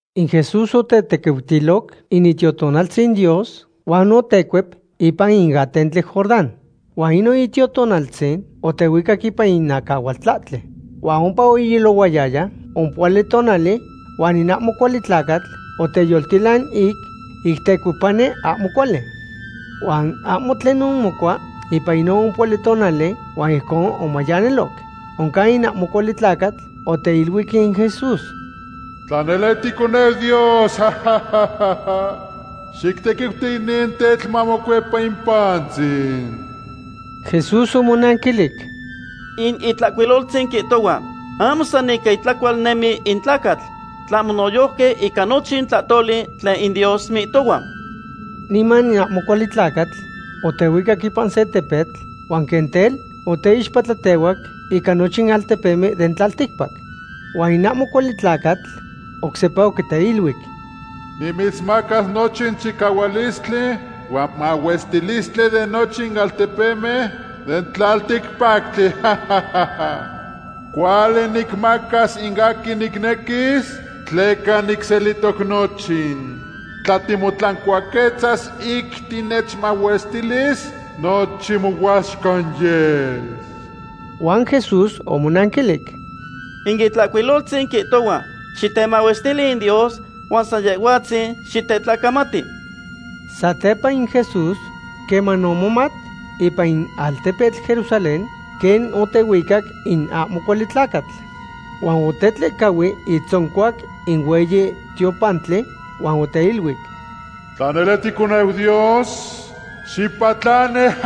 In Jesús otetequiutiloc in Itiotonaltzin Dios huan otecuep ipan in atentli Jordán. Huan inon Itiotonaltzin otehuicac ipan in acahualtlahtli. Huan ompa oilohuayaya ompohuali tonali huan in ahmo cuali tlacatl oteyoltilan ic tecuepani ahmo cuali. Huan ahmo tlen omocua ipan inon ompohuali tonali huan ijcon omayanilo. Oncan in ahmo cuali tlacatl oteiluic in Jesús: ―Tla nele titeconeu Dios, xictequiuti inin tetl mamocuepa in pantzin. Jesús omonanquilic: ―In Itlahcuiloltzin quihtohua: “Ahmo san ica itlacual nemis in tlacatl, tlahmo noyojqui ica nochin tlahtoli tlen in Dios mihtohua.” Niman in ahmo cuali tlacatl otehuicac ipan se tepetl huan quen tel oteixpatlatehuac ica nochin altepemen den tlalticpac. Huan in ahmo cuali tlacatl oc sepa oquiteluic: ―Nimitzmacas nochin chicahualistli huan mahuestilistli de nochin altepemen den tlalticpactli. Cuali nicmacas in aquin nicnequis tleca nicselihtoc nochin. Tla timotlancuaquetzas ic tinechmahuestilis, nochin mohuaxcan yes. Huan Jesús omonanquilic: ―In Itlahcuiloltzin quihtohua: “Xitemahuestili in Dios huan san Yehhuatzin xitetlacamati.” Satepa in Jesús queman omomat ipan in altepetl Jerusalén quen otehuicac in ahmo cuali tlacatl. Huan otetlehcahui itzoncuac in hueyi tiopantli huan oteiluic: ―Tla nele ticoneu Dios, xipatlani.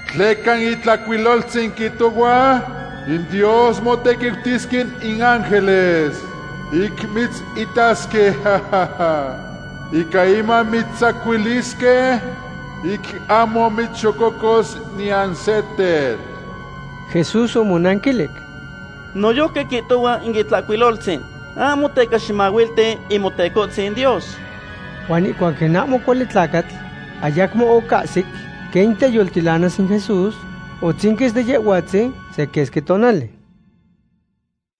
Tleca in Itlahcuiloltzin quihtohua: In Dios motequiutisque in ángeles ic mitzitasque. Ica inman mitztzacuilisque, ic ahmo mitzxococos niyan se tetl. Jesús omonanquilic: ―Noyojqui quihtohua in Itlahcuiloltzin: “Ahmo teca ximahuilti in Motecohtzin Dios.” Huan ihcuac in ahmo cuali tlacatl ayacmo ocahsic quen teyoltilanas in Jesús, otzinquis de Yehhuatzin se quesqui tonali.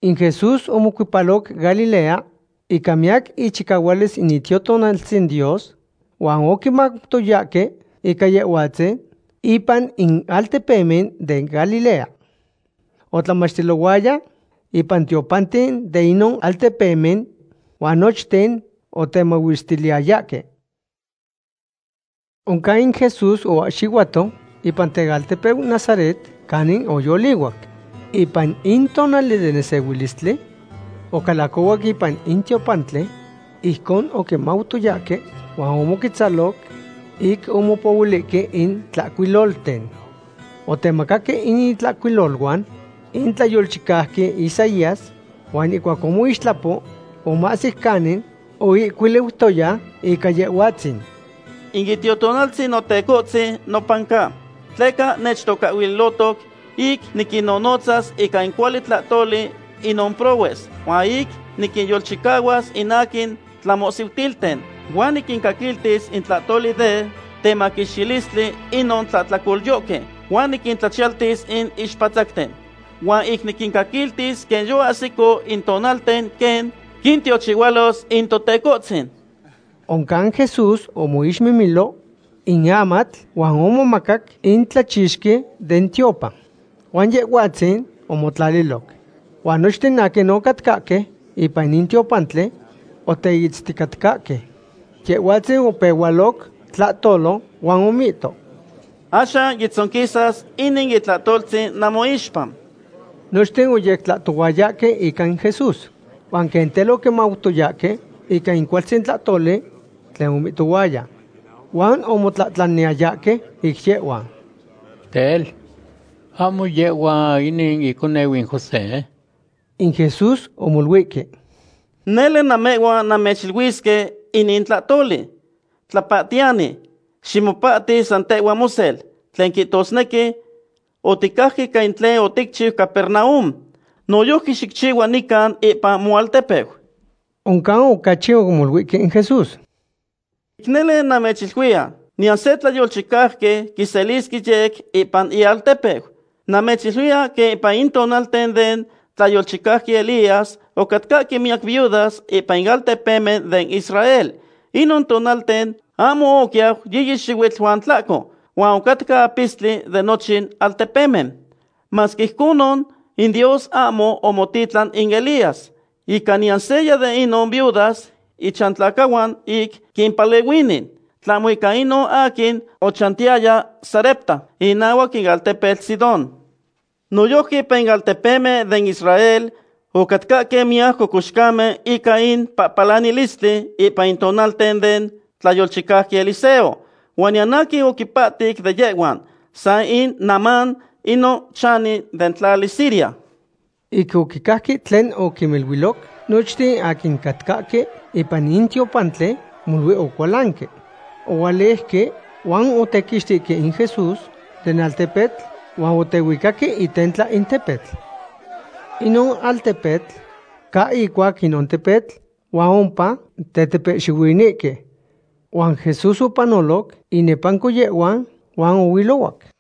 In Jesús omocuepaloc Galilea ica miyac ichicahualis in Itiotonaltzin Dios, huan oquimautoyahque ica Yehhuatzin ipan in altepemen den Galilea. Otlamachtilohuaya ipan in tiopanten de inon altepemen, huan nochten otemahuestiliyayahque. Oncan in Jesús oahxihuato ipan tealtepeu Nazaret canin oyolihuac. Ipan in tonali den nesehuilistli ocalacohuac ipan in tiopantli, ijcon oquimautoyahque, huan omoquetzaloc ic omopohuilihque in tlahcuilolten. Otemacaque in itlahcuiloluan in tlayolchicauqui Isaías, huan ihcuac omixtlapo, omahsic canin oihcuiliutoya ica Yehhuatzin: In Itiotonaltzin Notecohtzin nopan ca, tleca nechtocahhuilotoc ic niquinnonotzas ica in cuali tlahtoli inon prohues. Huan ic niquinyolchicahuas in aquin tlamohsihuilten. Huan niquincaquiltis in tlahtoli de temaquixtilistli inon tlahtlacolyohque, huan niquintlachiyaltis in ixpatzacten. Huan ic niquincaquiltis quen yoahsico in tonalten quen quintiochihualos in Totecohtzin. Oncan Jesús omoixmimilo in amatl huan omomacac in tlachixqui den tiopan huan Yehhuatzin omotlaliloc. Huan nochten aquin ocatcahque ipan in tiopantli oteitzticatcahque. Yehhuatzin opehualoc tlahtolo huan omihto: ―Axan yotzonquis inin itlahtoltzin namoixpa. Nochten oyectlahtohuayahque ica in Jesús huan quen tel oquimautoyahque ica in cualtzin tlahtoli tlen omihtohuaya. Huan omotlahtlaniyayahque ic yehhuan: ―Tel, ¿ahmo yehhua inin iconeu in José? In Jesús omoluihque: ―Nele namehhuan nannechiluisque inin tlahtoli: “Tlapahtiyani, ximopahti san tehhua mosel”; tlen quihtosnequi: “Oticajque ica tlen oticchiu Capernaum. Noyojqui xicchihua nican ipan moaltepeu.” Oncan ocachi omoluihque in Jesús: ―Ic nele namechiluiya, niyan se tlayolchicauqui quiselisque yec ipan ialtepeu. Namechyequiluiya quen ipan in tonalten den tlayolchicauqui Elías ocatcahque miyac viudas ipan in altepemen den Israel. Inon tonalten ahmo oquiyau yiyi xihuitl huan tlahco, huan ocatca apistli de nochin altepemen. Masque ijconon, in Dios ahmo omotitlan in Elías ica niyan seya de inon viudas ichantlacahuan ic quimpalehuini, tlahmo ica inon aquin ochantiyaya Sarepta, inahuac in altepetl Sidón. Noyojqui ipan in altepemen den Israel ocatcahque miyac cocoxcamen ica in pahpalanilistli ipan in tonalten den tlayolchicauqui Eliseo. Huan niyan aquin opahtic de yehhuan, san in Naamán, inon chani den tlali Siria. Ic oquicajque tlen oquiniluiloc, nochten aquin ocatcahque ipan in tiopantli molui ocualanque. Ohualejque huan otequixtihque in Jesús den altepetl huan otehuicaque itentla in tepetl. Inon altepetl ca icuac inon tepetl huan ompa tetepehxihuinihque. Huan Jesús opanoloc inepanco yehhuan huan ohuilohuac.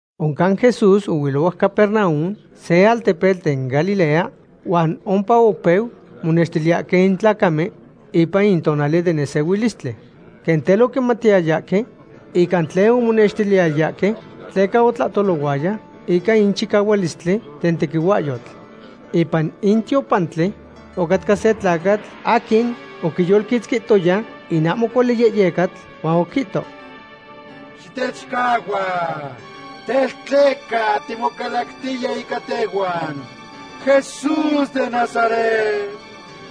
Oncan Jesús ohuilohuac Capernaum, se altepetl den Galilea, huan ompa opeu monextiliyahque in tlacamen ipan in tonali den nesehuilistli. Quen tel oquimatiyayahque ica tlen omonextiliyayahque, tleca otlahtolohuaya ica in chicahualistli den tequihuahyotl. Ipan in tiopantli ocatca se tlacatl aquin oquiyolquitzquihtoya in ahmo cuali yehyecatl, huan oquihto: ―¡Xitechcahua! Tel, ¿tleca timocalactiya ica tehhuan, Jesús den Nazaret?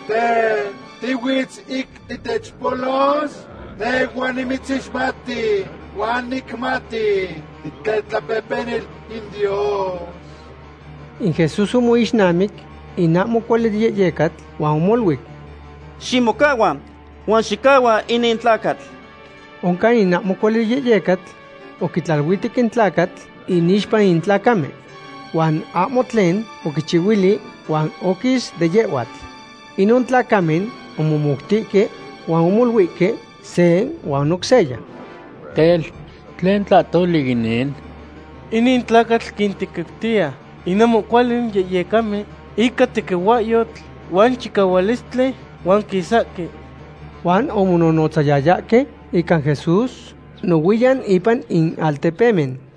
Tel, ¿tihuitz ic titechpolos? Nehhua nimitzixmati huan nicmati titetlapehpenil in Dios. In Jesús omoixnamic in ahmo cuali yehyecatl huan omoluic: ―¡Ximocahua huan xicahua inin tlacatl! Oncan in ahmo cuali yehyecatl oquitlaluihtec in tlacatl inixpa in tlacamen. Huan ahmo tlen oquichihuili huan oquis de yehhuatl. Inon tlacamen omomoutihque huan omoluihque se huan oc seya: ―Tel, ¿tlen tlahtoli inin? ¡Inin tlacatl quintequiutiya in ahmo cuali yehyecamen ica tequihuahyotl huan chicahualistli, huan quisahque! Huan omononotzayayahque ica Jesús nohuiyan ipan in altepemen.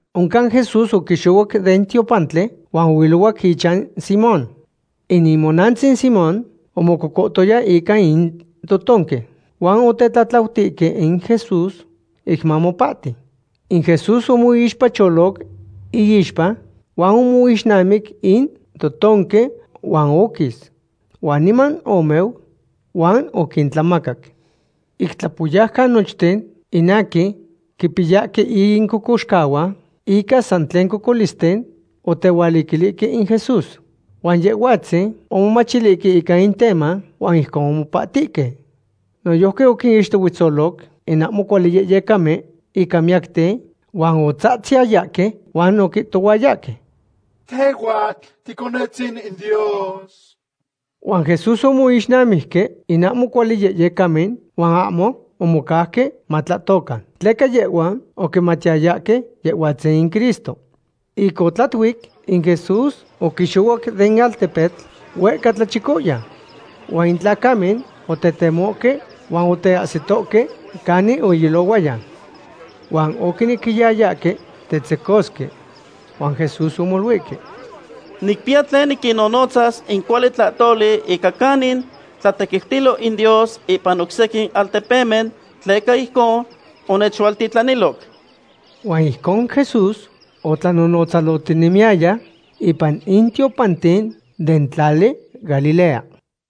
Oncan Jesús oquixohuac den tiopantli huan ohuilohuac ichan Simón. In imonantzin Simón omococohtoya ica in totonque, huan otetlatlautihque in Jesús ic mamopahti. In Jesús omixpacholoc iixpa huan omixnamic in totonque huan oquis. Huan niman omeu huan oquintlamacac. Ic tlapoyaucan nochten in aquin quipiyahque in cocoxcahuan ica san tlen cocolisten otehualiquilihque in Jesús. Huan Yehhuatzin omomachilihque ica in teman huan ijcon omopahtihque. Noyojqui oquinixtohuetzoloc in ahmo cuali yehyecamen ica miyacten, huan otzatziyayahque huan oquihtohuayahque: ―¡Tehhuatl ticonetzin in Dios! Huan Jesús omoixnamijque in ahmo cuali yehyecamen huan ahmo omocauque matlahtocan, tleca yehhuan oquimatiyayahque Yehhuatzin in Cristo. Ic otlatuic, in Jesús oquixohuac den altepetl huehca tlachicoyan. Huan in tlacamen otetemohque huan oteahsitohque canin oilohuaya. Huan oquinequiyayahque tetzecosque. Huan Jesús omoluihque: ―Nicpiya tlen niquinnonotzas in cuali tlahtoli ica canin tlatequiutilo in Dios ipan oc sequin altepemen, tleca ijcon onechualtitlaniloc. Huan ijcon Jesús otlanonotzalohtinemiyaya ipan in tiopanten den tlali Galilea.